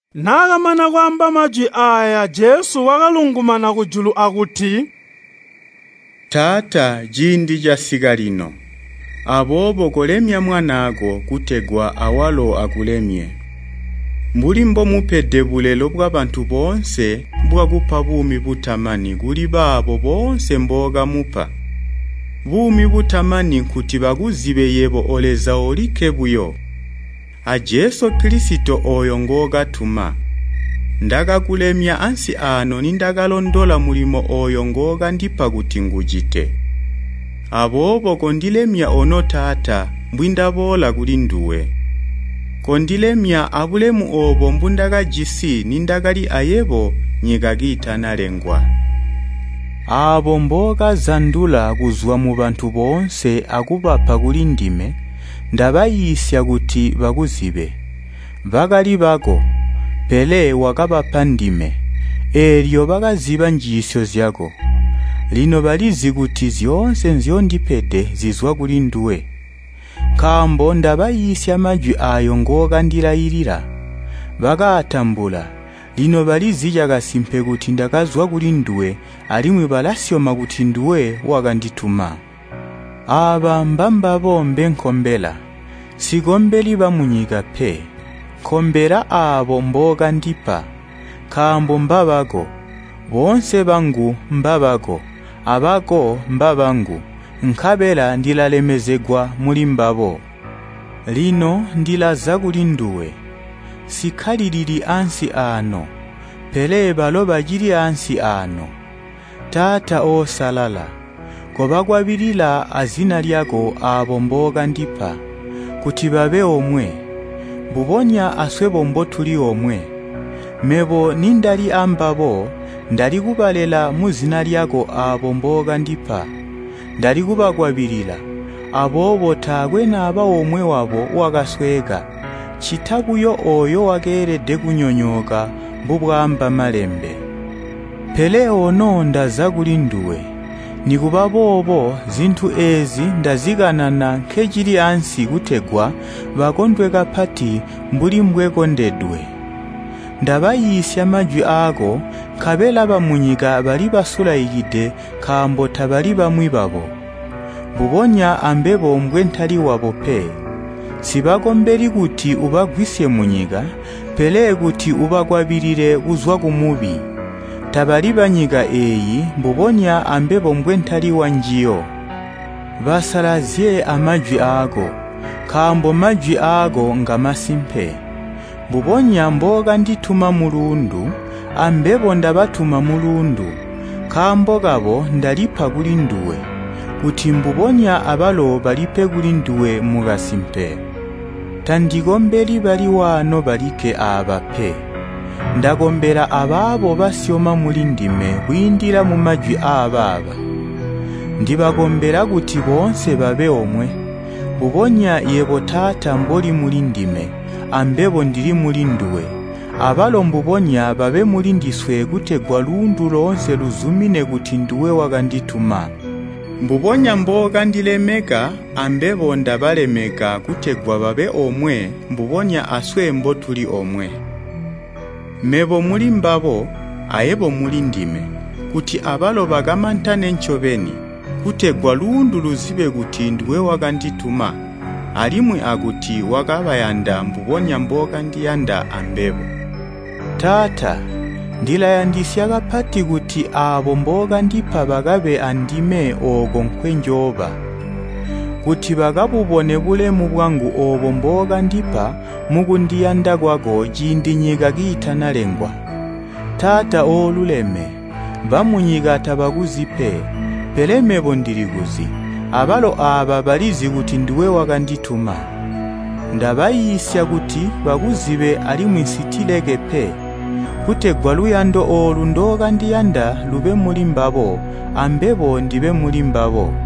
Naakamana kwaamba majwi aaya Jesu wakalungumana kujulu akuti, “Taata, ciindi casika lino, aboobo kolemya Mwanaako kutegwa awalo akulemye. Mbuli mbomupede bulelo bwabantu boonse bwakupa buumi butamani kuli baabo boonse mbookamupa. Buumi butamani, nkuti bakuzibe yebo O Leza olikke buyo, a Jesu Kilisito ngookatuma. Ndakakulemya ansi aano nindakalondola mulimo ooyo ngookandipa kuti ngucite. Aboobo kondilemya ono Taata mbwindaboola kulinduwe, kondilemya abulemu oobo mbundakajisi nindakali ayebo nyika kiitanalengwa. “Aabo mbookazandula kuzwa mubantu boonse akubapa kulindime, ndabaiisya kuti bakuzibe. Bakali bako, pele wakabapa ndime, eelyo bakaziba njiisyo zyako. Lino balizi kuti zyoonse nzyondipede zizwa kulinduwe, nkaambo ndabaiisya majwi aayo ngookandilailila. Bakaatambula, lino balizi cakasimpe kuti ndakazwa kulinduwe alimwi balasyoma kuti nduwe wakandituma. Aaba mbambabo mbenkombela. Nsikombeli bamunyika pe. Nkombela aabo mbookandipa, nkaambo mbabako. Boonse bangu mbabako, abako mbabangu, nkabela ndilalemezegwa mulimbabo. Lino ndilaza kulinduwe, nsikkalilili ansi aano, pele balo bacili ansi aano. Taata oosalala, kobakwabilila azina lyako aabo mbookandipa, kuti babe omwe, mbubonya aswebo mbotuli omwe. Mebo nindali ambabo, ndali kubalela muzina lyako aabo mbookandipa. Ndali kubakwabilila, aboobo taakwe naba omwe wabo wakasweeka, ccita buyo ooyo wakeelede kunyonyooka mbubwaamba Malembe. Pele ono ndaza kulinduwe, nikuba boobo zintu eezi ndazikanana nkencili ansi kutegwa bakondwe kapati mbuli mbwekondedwe. Ndabaiisya majwi aako nkabela bamunyika balibasulaikide nkaambo tabali bamwi babo, mbubonya ambebo mbwentali wabo pe. Nsibakombeli kuti ubagwisye munyika, pele kuti ubakwabilile kuzwa kumubi. Tabali banyika eeyi mbubonya ambebo mbwentali wanjiyo. Basalazye amajwi aako, nkaambo majwi aako ngamasimpe. Mbubonya mbookandituma muluundu, ambebo ndabatuma muluundu. Nkaambo kabo ndalipa kulinduwe, kuti mbubonya abalo balipe kulinduwe mukasimpe. “Tandikombeli bali waano balikke aaba pe, ndakombela abaabo basyoma mulindime kwiindila mumajwi aabaaba. Ndibakombela kuti boonse babe omwe, mbubonya yebo Taata mboli mulindime, ambebo ndili mulinduwe, abalo mbubonya babe mulindiswe kutegwa luundu loonse luzumine kuti nduwe wakandituma. Mbubonya mbookandilemeka ambebo ndabalemeka kutegwa babe omwe mbubonya aswe mbotuli omwe. Mebo mulimbabo, ayebo mulindime, kuti abalo bakamantane ncobeni, kutegwa luundu luzibe kuti nduwe wakandituma alimwi akuti wakabayanda mbubonya mbookandiyanda ambebo. Taata, ndilayandisya kapati kuti aabo mbookandipa bakabe andime ooko nkweenjooba. Kuti bakabubone bulemu bwangu oobo mbookandipa mukundiyanda kwako ciindi nyika kiitanalengwa. Taata ooluleme, bamunyika tabakuzi pe, pele mebo ndilikuzi, abalo aaba balizi kuti nduwe wakandituma. Ndabaiisya kuti bakuzibe alimwi nsitileke pe, kutegwa luyando oolu ndookandiyanda lube mulimbabo, ambebo ndibe mulimbabo.”